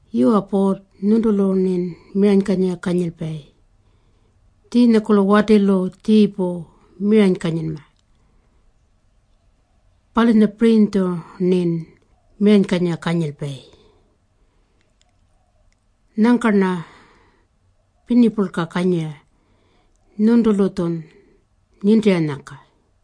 Yuwa Puurr, nyuntulu-rnin miranykanyira kanyilpayi. Tjiinyakurlu watilu tjiipu miranykanyinma. Palunyapirinytju-rnin miranykanyira kanyilpayi. Nyangka-rna pirnipurlka kanyira nyuntulu-tjun nintiranyangka.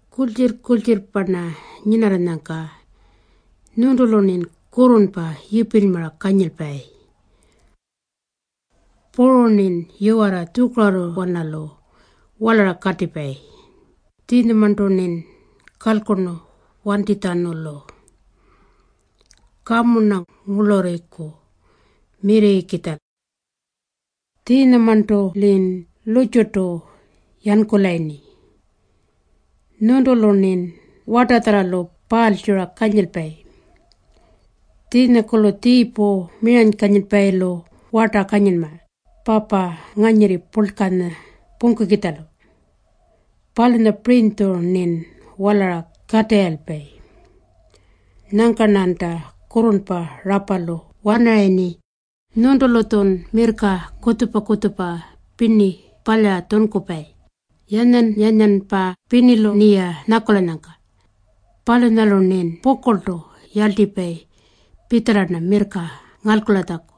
Kurltjirr-kurltjirrpa-rna nyinarranyangka nyuntulu-rnin kurrurnpa yipilymara kanyilpayi. Puru-rnin yiwarra tjukarurruwanalu walara katipayi, tjiinyamarntu-rnin kalkurnu wantinytjatjanulu. Kamu-rna ngurlurriku mirrirrikitja. Tjiinyamarntu-lin lurrtjurtu yankulayirni. Nyuntulu-rnin wartatjarralu paalytjura kanyilpayi. Tjiinyakurlu tjiipu miranykanyilpayilu warta kanyinma papa nganyirri purlkanya pungkukitjalu. Palunyapirinytju-rnin walara katirrayilpayi. Nyangka-rnanta kurrurnpa rapalu wanarayirni. Nyuntulu-tjun mirrka kutjupa-kutjupa pirni palyara tjunkupayi, yanyan-yanyanpa pirnilu-rniya nyakulanyangka. Palunyalu-rnin pukurltu yarltipayi pitjala-rna mirrka ngalkulatjaku.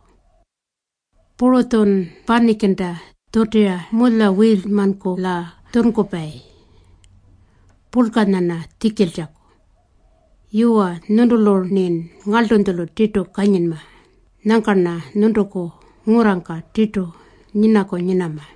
Puru-tjun panikinta tjutira mulyawiilymankula tjunkupayi purlkanya-rna tjikiltjaku. Yuwa, nyuntulu-rnin ngarltunytjulu tirtu kanyinma. Nyangka-rna nyuntuku ngurrangka tirtu nyinaku nyinama.